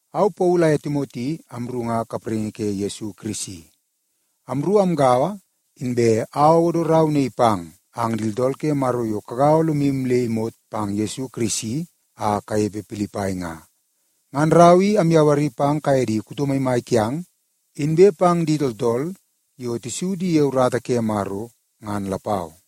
Au Paulu aye Timoti amru nga kapraingi ke Yesu Kirisi. Amru amgaua, inbe au awodo rau naii pang ang di tooltool ke Maro yo kagaua lomu le imot pang Yesu Kirisi a kanepe Pilipai nga. Ngan rau i amyawari pang kaye di kuto maimai kiang, inbe pang di tooltool yo tisu di ye urata ke Maro ngan lapau.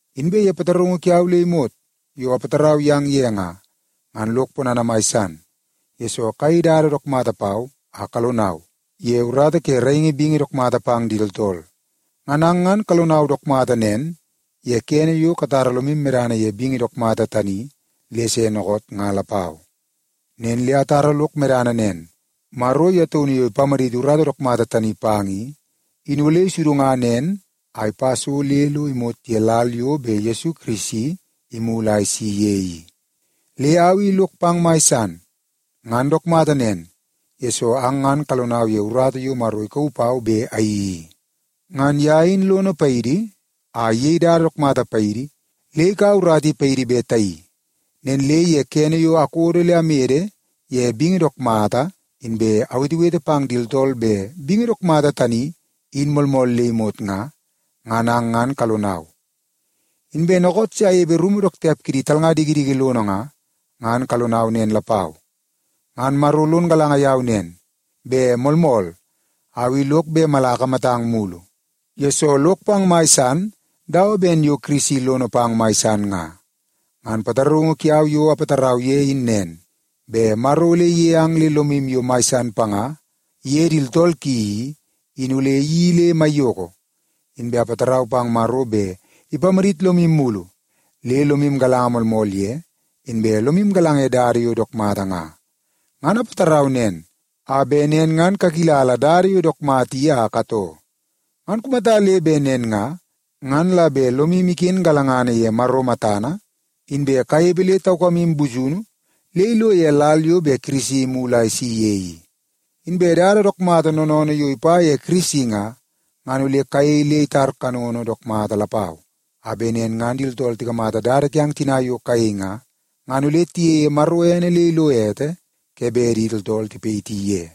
Inbe ye pataraungu kiau le imot yo apatarau yang ye nga, ngan lok ponana mai san, yesoo kayei dada dook mata pau a kalonau ye urata ke raingi bingi dook mata pang di tooltool. Ngan ang ngan kalonau dook mata nen ye kene yo katara lomu medana ye bingi dook mata tani le se dookoot nga lapau. Nen le atara lok medana nen, Maro ye taunu yo ipamaditi urata dook mata tani pang i, in ole isudunga nen a ipa so le lo imot ye lal yo bet Yesu Kirisi imulu a isi ye i. Le au i lok pang mai san. Ngan dook mata nen, yesoo ang ngan kalonau ye urata yo Maro ikauu pau bet ayeii i. Ngan ye in lono paidi a iyei dada dook mata paidi le ikaua urata i paidi bet tayeii. Nen le ye kene yo akodo le amede ye bingi dook mata inbe awetewete pang di tooltool bet bingi dook mata tani in moolmool le imot nga, ngan ang ngan kalonau. Inbe dookoot se anepe rumu dook tiap kidi talnga dikidiki lono nga, ngan kalonau nen lapau. Ngan Maro lon galanga yau nen, bet moolmool au i lok bet mala akamatang mulu, yesoo lok pang mai san dawa ben yo Yesu Kirisi lono pang mai san nga. Ngan pataraungu kiau yo apatarau ye in nen, bet Maro ole iyei ang le lomu yo mai san panga iye di tooltool ki i, in ole iyeii le maiyoko. Inbe apatarau bet Maro ole ipamadit lomu mulu le lomu galanga moolmool ye, inbe lomu galanga ye dada yo dook mata nga. Ngan apatarau nen, a bet nen ngan kakilala dada yo dook mata i a katoo. Ngan kumata le bet nen nga, ngan la bet lomu iken galangana ye Maro matana, inbe kanepe le taukamu busunu le ilo ye lal yo bet Kirisi imulu a isi ye i. Inbe dada dook mata noonoonoo yo ipa ye Yesu Kirisi nga, ngan ole kayei le itar kanono dook mata lapau, a bet nen ngan di tooltool tikamata dada kiang tina yo kayei nga, ngan ole tiyeie Maro ene le ilo ete ke bet di tooltool tipayiti ye.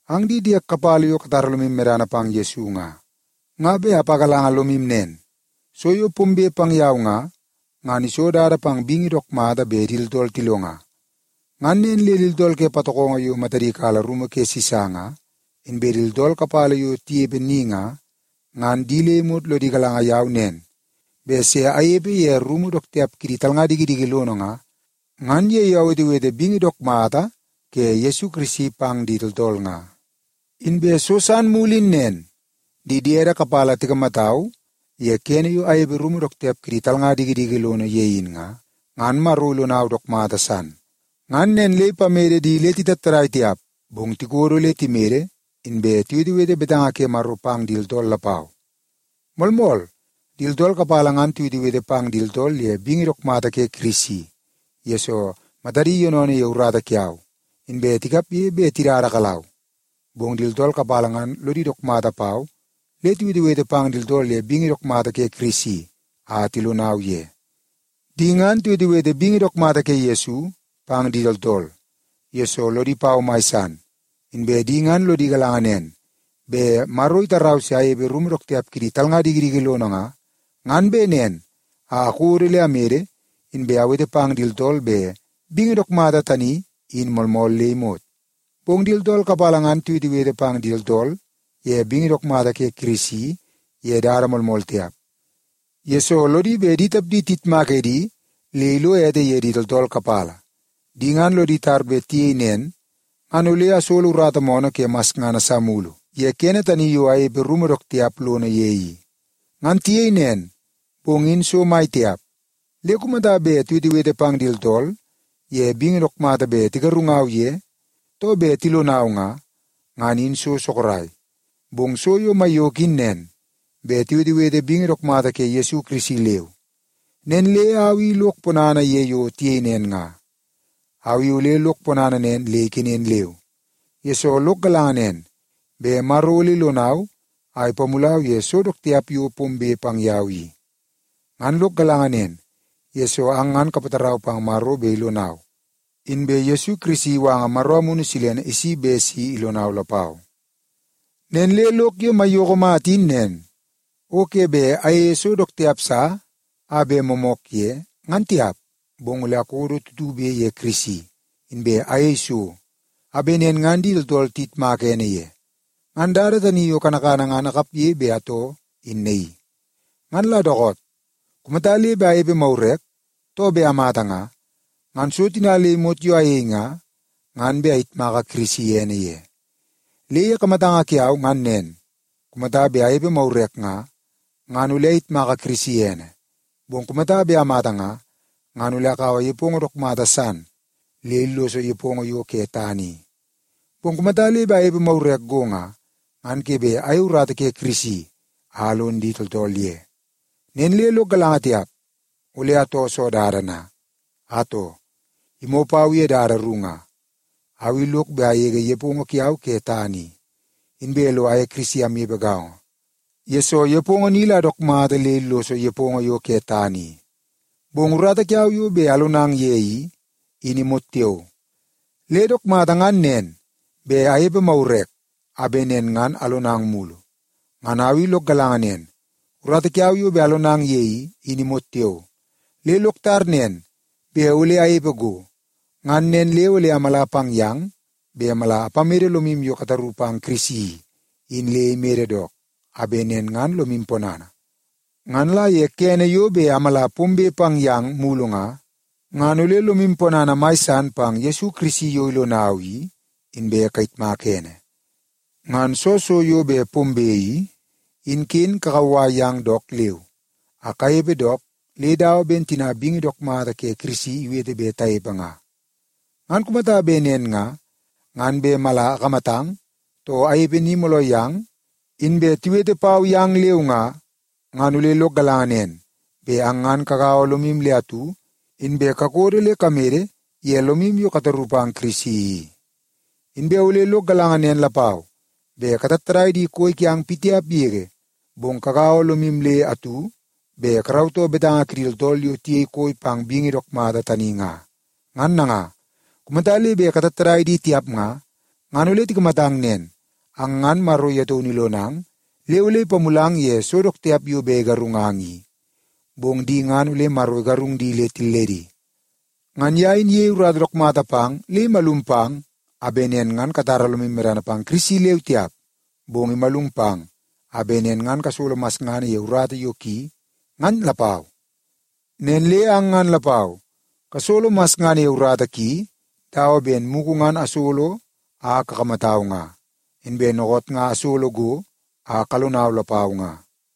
Ang di diek kapala yo katara lomu medana pang Yesu nga, nga bet apagalanga lomu nen. So yo pombe pang yau nga, ngan iso dada pang bingi dook mata bet di tooltool tilonga. Ngan nen le di tooltool ke patokongo yo matadi kala rumu ke Sisa nga, inbe di tooltool kapala yo tinepe ni nga, ngan di le imot lodi galanga yau nen bet se anepe ye rumu dook tiap kidi talnga dikidiki lono nga, ngan ye yo awetewete bingi dook mata ke Yesu Kirisi pang di tooltool nga. Inbe so san mulu in nen. Di diede kapala tikamatau ye kene yo anepe rumu dook tiap kidi talnga dikidiki lono ye in nga, ngan Maro ilonau dook mata san. Ngan nen le ipamede di le titattadai tiap, bong tikodo le timede, inbe tiwetewete betanga ke Maro pang di tooltool lapau. Moolmool, di tooltool kapala ngan tiwetewete pang di tooltool ye bingi dook mata ke Kirisi, yesoo matadi yoonoonoo ye urata kiau, inbe tikapge bet tidada kalau. Bong di tooltool kapala ngan lodi dook mata pau le tiwetewete pang di tooltool ye bingi dook mata ke Kirisi a tilonau ye. Di ngan tiwetewete bingi dook mata ke Yesu pang di tooltool, yesoo lodi pau mai san. Inbe di ngan lodi galanga nen bet Maro itarau se anepe ye rumu dook tiap kidi talnga dikidiki lono nga, ngan bet nen a akodo le amede, inbe awete pang di tooltool bet bingi dook mata tani in moolmool le imot. Bong di tooltool kapala ngan tiwetewete pang di tooltool ye bingi dook mata ke Kirisi ye dada moolmool tiap, yesoo lodi bet di tapdi tiyitmak edi le ilo ete ye di tooltool kapala. Di ngan lodi tar bet tiyei nen ngan ole asolo urata moonoo ke masngana sa mulu ye kene tani yo anepe rumu dook tiap lono ye i. Ngan tiyei nen, bong in so mai tiap. Le kumata bet tiwetewete pang di tooltool ye bingi dook mata bet tigarungau ye, too bet tilonau nga, ngan in so sorok. Bong so yo maiyoko in nen, bet tiwetewete bingi dook mata ke Yesu Kirisi leu. Nen le au i lok ponana ye yo tiyei nen nga. Au i ole lok ponana nen le ikenen leu, yesoo lok galanga nen, bet Maro ole ilonau a ipamulau ye so dook tiap yo pombe pang yau i. Ngan lok galanga nen, yesoo ang ngan kapatarau pang Maro bet ilonau, inbe Yesu Kirisi iwanga Maro Amunu Silene isi bet si ilonau lapau. Nen le lok yo maiyoko mata in nen, o ke bet ayeie so dook tiap sa a bet moomook ye, ngan tiap, bong ole akodo tutube ye Kirisi, inbe ayei so a bet nen ngan di tooltool tiyitmaka ene ye. Ngan dada tani yo kanakana ngan akapge bet atoo in naii. Ngan la dookoot nga, kumata le bet anepe magurek, too bet amata nga, ngan so tina le imot yo ayei nga, ngan bet ayitmaka Kirisi ene ye. Le ye kamatanga kiau ngan nen, kumata bet anepe magurek nga, ngan ole ayitmaka Kirisi ene, bong kumata bet amata nga, ngan ole akaua nepongo dook mata san le illoso nepongo yo ke tana i. Bong kumata le bet anepe magurek go nga, ngan ke bet ayei urata ke Kirisi a alon di tooltool ye. Nen le lok galanga tiap, ole atoo soo dada na? Atoo, imoo pau ye dada ru nga. Au i lok bet agege nepongo kiau ke tana i, inbe lo aye Kirisi amnepe gaongo, yesoo nepongo ni la dook mata le illoso nepongo yo ke tana i. Bong urata kiau yo bet alonang ye i, in imot tiao. Le dook mata ngan nen, bet anepe magurek a bet nen ngan alonang mulu. Ngan au i lok galanga nen, urata kiau yo bet alonang ye i, in imot tiao. Le lok tar nen bet ole anepe go. Ngan nen le ole amala pang yang bet mala apamede lomu yo kataru pang Yesu i, in le imede dook, a bet nen ngan lomu ponana. Ngan la ye kene yo bet amala pombe pang yang mulu nga, ngan ole lomu ponana mai san pang Yesu Kirisi yo ilonau i, inbe kayitmaka ene. Ngan soo so yo bet pombe i, in ken kakauwai ang dook leu a kanepe dook le dawa ben tina bingi dook mata ke Kirisi iwete bet tanepe nga. Ngan kumata bet nen nga, ngan bet mala akamatang, too anepe ni mooloo yang inbe tiwete pau yang leu nga, ngan ole lok galanga nen, bet ang ngan kagaua lomu le atu, inbe kakodo le kamede ye lomu yo kataru pang Kirisi i. Inbe ole lok galanga nen lapau, bet katattadai di koi kiang pitiap yege, bong kagaua lomu le atu bet karautoo betanga kidi tooltool yo tiyei koi pang bingi dook mata tani nga. Ngan nanga, kumata le bet katattadai di tiap nga, ngan ole tikamatang nen; ang ngan Maro ye taunu ilonang le ole ipamulang ye so dook tiap yo bet igarungang i, bong di ngan ole Maro igarung di le tilledi. Ngan ye in iyei urata dook mata pang le imalum pang a bet nen ngan katara lomu medana pang Kirisi leu tiap, bong imalum pang a bet nen ngan kasolo masngana ye urata yo ki, ngan lapau. Nen le ang ngan lapau kasolo masngana ye urata ki dawa ben mugu ngan asolo a kakamatau nga, inbe dookoot nga asolo go a kalongau lapau nga.